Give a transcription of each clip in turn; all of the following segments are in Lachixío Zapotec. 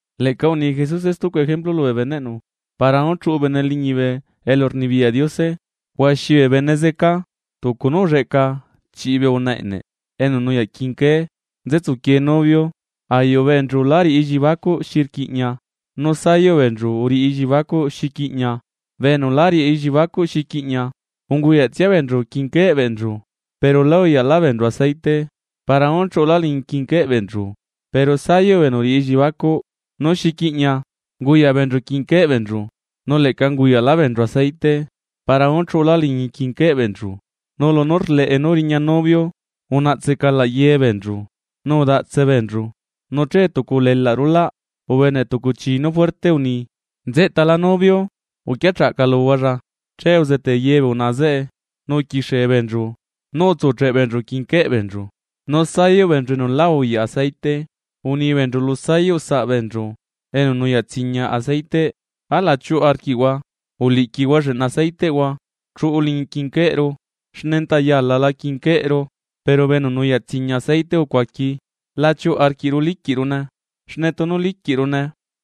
’Leꞌca uni Jesuse stucu ejemplu lubee beneꞌnu: Para nú chuꞌu bene liñibe elurnibiyaꞌ Diose, huaxi bee bene zeca tucu nú ulleꞌca chiꞌi bee unaꞌa eꞌneꞌ enu nuyaꞌ quinqué nzetsuquiee novio. Ayuꞌ beenchu lá riꞌi elliebacuꞌ xi rquiꞌña nu sayuꞌ beenchu uriꞌi elliebacuꞌ xi quiꞌñia. Bee enu lá riꞌi elliebacuꞌ xi quiꞌña, unguyaꞌtsia beenchu quinquéꞌ beenchu pero né uyaꞌlá beenchu aceite para nú chuꞌulá liñi quinquéꞌ beenchu, pero sayuꞌ bee enu uriꞌi elliebacuꞌ nú xi quiꞌña, unguyaꞌ beenchu quinquéꞌ beenchu nu leꞌca unguyaꞌlá beenchu aceite para nú chuꞌulá liñi quinquéꞌ beenchu. Nu lunú rleꞌe nú riña novio, unaꞌtse calaꞌ ye beenchu, nu udaꞌtse beenchu. Nu che tucu ulelaꞌ rulaꞌ, ubene tucu chi nú juerte uni: “¡Nzeꞌtala novio; uquia chaꞌcaluhualla!” Che uzetee ye bee unaꞌa zeꞌe, nu uquixie beenchu nú utsucheꞌ beenchu quinquéꞌ beenchu. Nu sayuꞌ beenchu enu lá auyaꞌ aceite uni beenchu lu sayuꞌ saꞌbeenchu enu nuyaꞌ tsiña aceiteꞌ: “Alaꞌ chiuꞌu arquiꞌhua uliꞌquihua lleꞌna aceiteꞌhua chuꞌu liñi quinquéꞌru, xne enta yalala quinquéꞌru.” Pero bee enu nuyaꞌ tsiña aceite ucuaqui: “La chiuꞌu arquiꞌru liquiꞌrune, xne tunu liquiꞌrune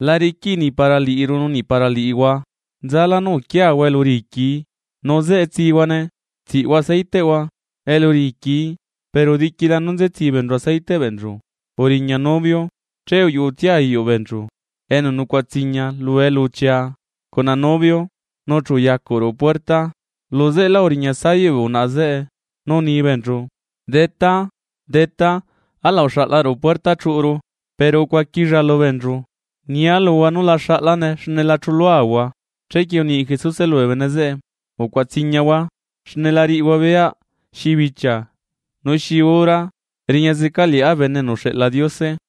la riquiꞌi niꞌ para liꞌiru nu niꞌ para liꞌihua. Nzala nú uquiahua elu riquii nu zeꞌe tsihuane tsiꞌhua aceiteꞌhua elu riquii.” Pero diquila nú nze tsi beenchu aceiteꞌ beenchu, uriña novio. Che uyuꞌutsia ayuꞌ beenchu enu nucuaꞌa tsiña lu eluchia, cuna novio, nu chu uyacuꞌ ruꞌu puerta. Luzeꞌelá uriña sayuꞌ bee unaꞌa zeꞌe, nu uni beenchu: “¡Detá, detá, alaꞌ uxaꞌla ruꞌu puerta chuꞌuru!” Pero ucuaquilla lubeenchu: “Nia luhua nú la xaꞌlane xne la chuluahua.” Chequie uni Jesuse lubee bene zeꞌe: ―Ucuaꞌa tsiñahua, xne la riꞌihua beyaꞌ xi bichia nu xi hora riña zeca Liꞌá Bene enu uxeꞌla Diose.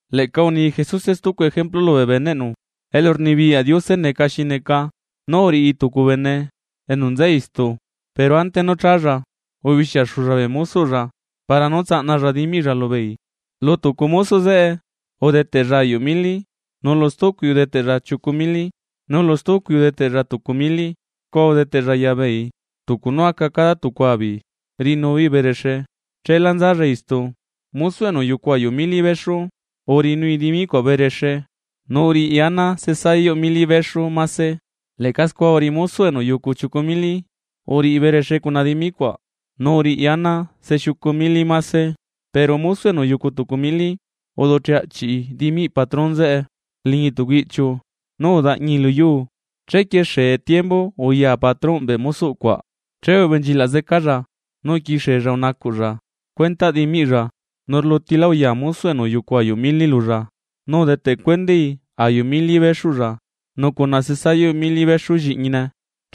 ’Leꞌca uni Jesuse stucu ejemplu lubee beneꞌnu: Elurnibiyaꞌ Diose neca xi neca nú uriꞌi tucu bene enu nza istu, pero ante nú challa ubixiaxulla bee mosoꞌlla para nú tsaꞌnalla dimiꞌlla lubeei. ’Lu tucu mosoꞌ zeꞌe udeteꞌlla ayuꞌ mili, nulu stucui udeteꞌlla chiucu mili, nulu stucui udeteꞌlla tucu mili. Scua udeteꞌlla yabeei tucu nú aca cada tucua beei riꞌinu beei berexe. Cheelá nzalla istu. Mosoꞌ enu uyucu ayuꞌ mili bexu, uriꞌinui dimi cuaꞌ berexe nu uriꞌi ana se sayuꞌ mili bexu mase. Leꞌca scua uriꞌi mosoꞌ enu uyucu chiucu mili, uriꞌi berexe cuna dimi cuaꞌ, nu uriꞌi ana se xiucu mili mase. Pero mosoꞌ enu uyucu tucu mili, uducheꞌ aꞌchiꞌi dimiꞌ patron zeꞌe liñi tucu iꞌchiu nú udaꞌñii lu yuu. ’Chequie xee tiembu uya patrónꞌ bee mosoꞌ cuaꞌ, che ubenchilaꞌ zecalla nu uquixiella unacuꞌlla cuentaꞌ dimiꞌlla. Nu rlutila uya mosoꞌ enu uyucu ayuꞌ mili lulla, nu udeteꞌ cuendai ayuꞌ mili bexuꞌlla nu cuna se sayuꞌ mili bexu lliꞌñine,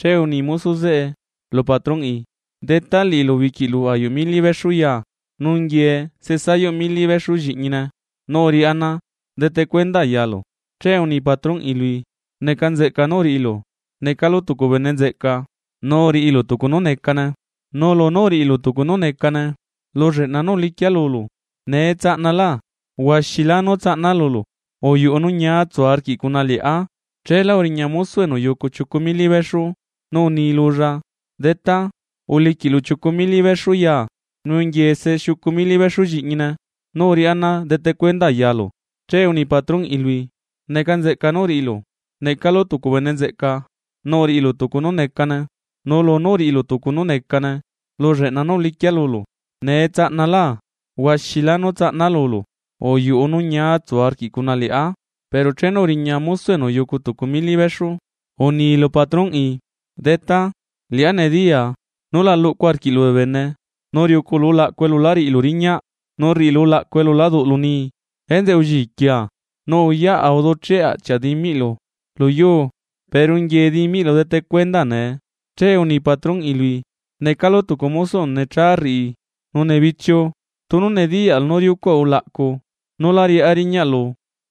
che uni mosoꞌ zeꞌe lu patronꞌi: “Detá, liꞌilu uliquiꞌlu ayuꞌ mili bexu ya nu nguie se sayuꞌ mili bexu lliꞌñine nú uriꞌá ana dete cuenda yaalu.” Che uni patronꞌi lui: “Neca nzeꞌca nú uriꞌilu, necalu tucu bene nzeꞌca. Nu uriꞌilu tucu nú necane, nu lunú uriꞌilu tucu nú necane lu lleꞌna nú uliquia lulu, nee tsaꞌnalá huaxilá nú tsaꞌna lulu. Uyuꞌu nu ñia utsu arquiꞌ cuna liꞌá.” Chela uriña mosoꞌ enu uyucu chiucu mili bexu, nu uni lulla: “Detá, uliquiꞌlu chiucu mili bexu ya, nu nguie se xiucu mili bexu lliꞌñine nú uriꞌá ana dete cuenda yalu.” Che uni patronꞌi lui: “Neca nzeꞌca nú uriꞌilu, necalu tucu bene nzeꞌca. Nu uriꞌilu tucu nú necane nu lunú uriꞌilu tucu nú necane lu lleꞌna nú uliquia lulu, nee tsaꞌnalá huaxilá nú tsaꞌna lulu. Uyuꞌu nu ñia utsu arquiꞌ cuna liꞌá.” Pero chenu uriña mosoꞌ enu uyucu tucu mili bexu, uni lu patronꞌi: “Detá, liꞌá nediyaa nú la luꞌcu arquiꞌlu bee bene, nu riuculu ulaꞌcu elu lá riꞌilu riñaꞌ nu rriꞌilu ulaꞌcu elu lá duꞌlu nii. Enzeꞌe ulliquia, nu uyaꞌa uducheꞌ aꞌchiaꞌa dimiꞌlu luyuu. Pero nguie dimiꞌlu dete cuenda nee.” Che uni patronꞌi lui: “Necalu tucu mosoꞌ enu necha rriꞌi nu nebichiu. Tunu nediyaꞌlu nú riucuaꞌa ulaꞌcu nú lá riꞌá riñaꞌlu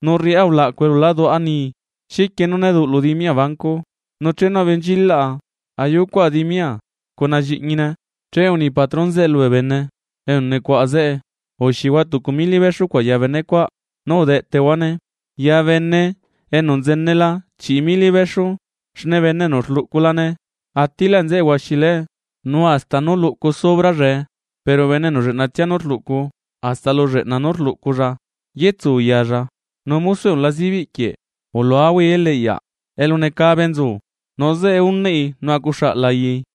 nu rriꞌá ulaꞌcu elu lá duꞌa nii, ¿xiquie nú né duꞌlu dimia banco? Nu chenu benchilaꞌa ayucuaꞌa dimia cuna lliꞌñine.” Che uni patron zeꞌe lubee bene enu nucuaꞌa zeꞌe: “Uxihua tucu mili bexu cuaꞌ ya benecuaꞌ, nu udeꞌteꞌhuane ya bene enu nzenela chiꞌi mili bexu. Xne bene enu rluꞌculane atiꞌlaꞌ nzeꞌe huaxiláe, nu hasta nú luꞌcu sobrallae, pero bene enu lleꞌnatsia nú rluꞌcu, hasta lu lleꞌna nú rluꞌculla yetsu yalla. Nu mosoꞌ enu la zibiꞌ quieꞌ, uluahuai eliꞌyaꞌ elu necabe nzu, nu zeꞌe unaꞌi nu acuxaꞌ layai.”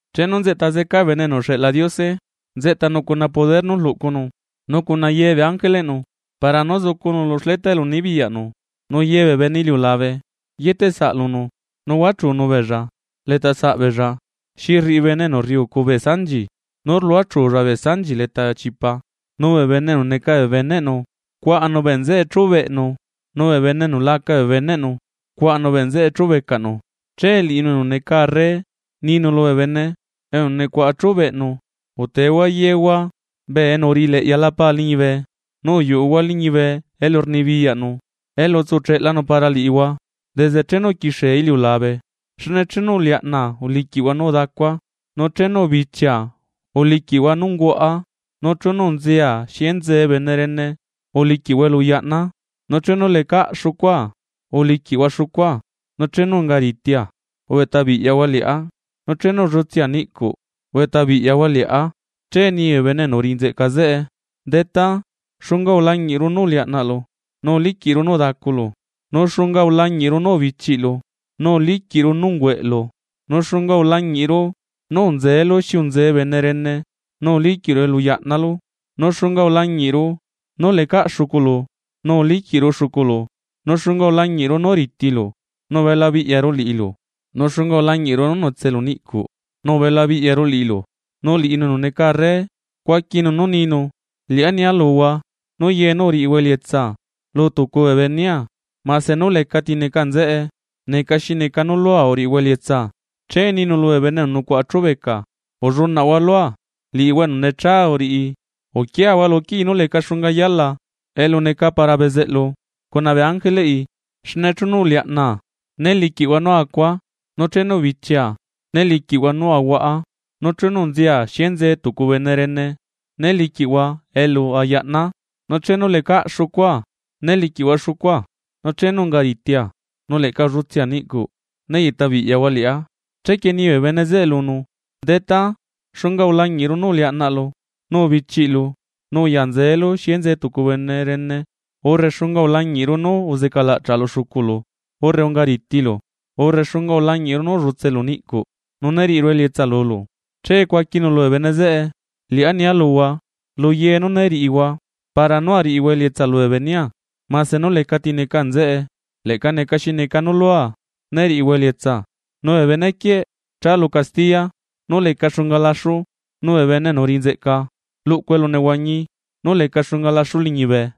’Chenu nzeꞌta zeca Bene enu uxeꞌla Diose nzeꞌtanu cuna poder nú rluꞌcunu, nu cuna ye bee ángeleꞌnu para nú zucunu lu xleta elu nibiyaꞌnu. Nu ye bee bene iliulabe yeteꞌsaꞌ lunu, nu huachunu beella letasaꞌ beella, xi rriꞌi bene enu rriucu bee sanchi nú rluachulla sanchi leta bee chipa. Nu bee bene enu neca bee beneꞌnu cuaꞌanu bee nzeꞌe chubeꞌnu nu bee bene enu laca bee beneꞌnu cuaꞌanu bee nzeꞌe chubecaꞌnu. Che liꞌinu enu neca arre ninu lubee bene enu nucuaꞌa chubeꞌnu: “Utehua yehua bee enu uriꞌi leꞌyala Pa liñibe. Nu uyuꞌuhua liñibe elu rnibiyaꞌnu elu utsucheꞌlanu para liꞌihua desde chenu uquixie iliulabe. Xne chenu uliaꞌnaa uliquiꞌhua nú udacua, nu chenu ubichia uliquiꞌhua nú ungüaꞌa, nu chenu unzea xi enze bene rene, uliquiꞌhua elu uyaꞌnaa. Nu chenu lecaꞌ xucua uliquiꞌhua xucua, nu chenu unga ritia ubeꞌta biꞌyahua liꞌá, nu chenu ullutsea niꞌcuꞌ ubeꞌta biꞌyahua liꞌá.” Che ni bee bene enu uriꞌi nzeꞌca zeꞌe: “Detá, ¿xunga ulañiꞌru nú uliaꞌnaꞌlu nu uliquiꞌru nú udaculu? Nu ¿xunga ulañiꞌru nú ubichiꞌlu nu uliquiru nú ungüeꞌlu? Nu ¿xunga ulañiꞌru nú unzelu xi unzee bene rene, nu uliquiꞌru elu uyaꞌnalu? nu ¿xunga ulañiꞌru nú lecaꞌ xuculu, nu uliquiꞌru xuculu? ¿Nu xunga ulañiꞌru nú ritilu nu ubela biꞌyaru liꞌilu?, nu ¿xunga ulañiꞌru nú netselu niꞌcuꞌ nu ubela biꞌyaru liꞌilu?” Nu liꞌinu enu neca arre, cuaquinu nú ninu: “Liꞌá nia luhua nú ye nú uriꞌihua elietsa lu tucu bee benea mase nú lecati neca nzeꞌe, neca xi neca nú lua uriꞌihua elietsa.” ’Che ninu lubee bene enu nucuaꞌa chubeca: “Ullunaꞌhua lua, liꞌihua enu necha uriꞌi, uquiahua lu quii nú leca xunga yala elu neca para bezeꞌlu cuna bee ángeleꞌi. Xne chenu uliaꞌnaa, né liquiꞌhua nú acua, nu chenu ubichia, né liquiꞌhua xi ahuaꞌa; nu chenu unzea xi enzee tucu bene rene né liquiꞌhua elu ayaꞌnaa, nu chenu lecaꞌ xucua né liquiꞌhua xucua nu chenu ungaritia, nu leꞌca ullutsea niꞌcuꞌ né yeꞌta biꞌyahua liꞌá.” Chequie ni bee bene zeꞌe lunu: “Detá, ¿xunga ulañiꞌru nú uliaꞌnaꞌlu nu ubichiꞌlu, nu uya nzeelu xi enzee tucu bene rene, urre xunga ulañiꞌru nú uzecalaꞌchaꞌlu xuculu, urre ungaritilu, urre xunga ulañiꞌru nú ullutselu niꞌcuꞌ, nu ne riꞌiru elietsa lulu?” Che cuaquinu lubee bene zeꞌe: “Liꞌá nia luhua, luye nú né riꞌihua para nú ariꞌihua elietsa lubee benea mase nú lecati neca nzeꞌe, leꞌca neca xi neca nú lua né riꞌihua elietsa.” Nu bee bene quieꞌ chaa lu castiya nú leca xunga laxu, nu bee bene enu uriꞌi nzeꞌca luꞌcu elu nehuañi nú leca xunga laxu liñibe.